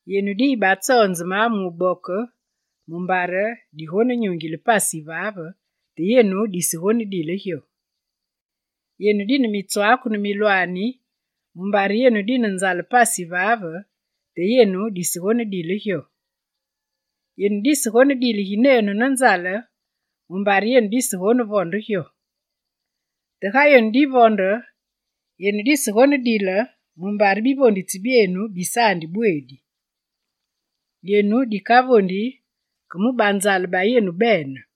Yenu diyibatsonzeme mu wuboke mumbare yenu digonenyungile pasi yivaave, te yenu disegonedile gyo. Yenu dine mitswaaku ne milwaani mumbare yenu dine nzale pasi yivaave, te yenu disegonedile gyo. Yenu disegonedile ginenu ne nzale mumbare yenu disegonevonde gyo. Te ga yenu divonde, yenu disegonedile mumbare bivonditsi byenu bisaandi bweedi: yenu dikavondi ke mu banzale ba yenu bene.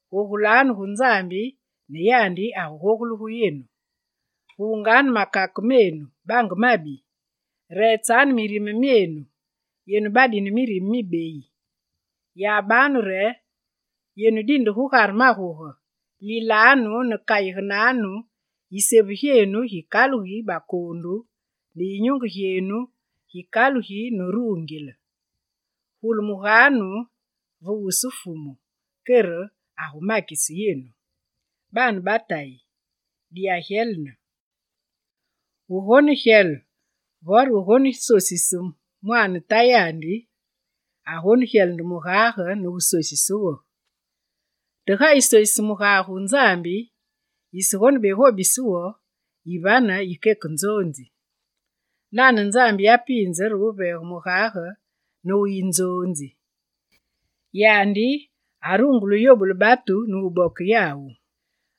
Gogulanu gu Nzambi ne yandi agugogule gu yenu. Gunganu makake menu, bange mabi; reetsanu mirime myeenu, yenu badine mirime mibeyi! Yabanu re yenu dinde gugare maguge, lilanu ne kayigenenganu, isevu gyeenu gikalugi bakoondu ne yinyunge gyeenu gikalugi ne ruungile. Gulumuganu ve wusu Fumu kere agumakise yenu. Baane ba Tayi, diyagyelene. Wugonegyele vore wusosise mwaane tayandi, agonegyele nde mugage ne wusosise wo. Te ga yisosise mugage wu Nzambi, yisegonebegobise wo, yivane yikeke nzoonzi. Nane Nzambi yapiinze re wuveege mugage ne wuyi nzoonzi; yandi arungule wuyobule batu ne wuboke yawu.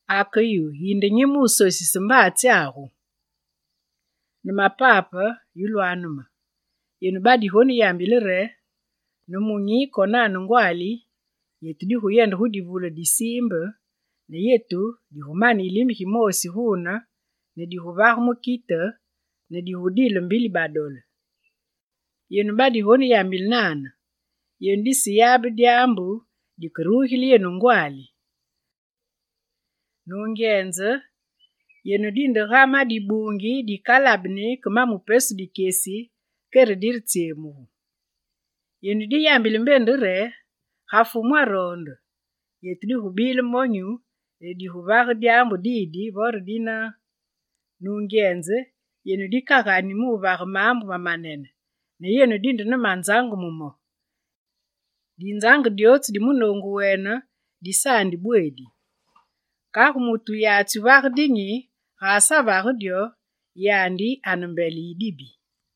Ake yu, yinde nyi mu wusosise mbaatsyagu? Nemapape yulwanu me, yenu badigoneyambile re: «Nemunyi konane ngwaali yetu diguyende gu divule di siimbe, ne yetu digumane yilime gimoosi guune ne diguvage mukite ne digudile mbili badole.» Yenu badigoneyambile nane, yenu diseyabe dyaambu dikerugile yenu ngwaali. Nungyenze, yenu dinde ga ma dibuungi dikalabeni ke ma mu pesu dikyesi kere diretsyemugu. Yenu diyambile mbe nde re: «Ga Fumu aroonde, yetu digubile monyu ne diguvage dyaambu didi vore dina.» Nungyenze, yenu dikagani wuvage maambu mamanene, ne yenu dine manzange mu mo. Dinzange dyootsu di munoongu wene disaandi bweedi. Kagu, mutu wuyatsi wuvage dinyi, ga asavage dyo, yandi ane mbele yi dibi.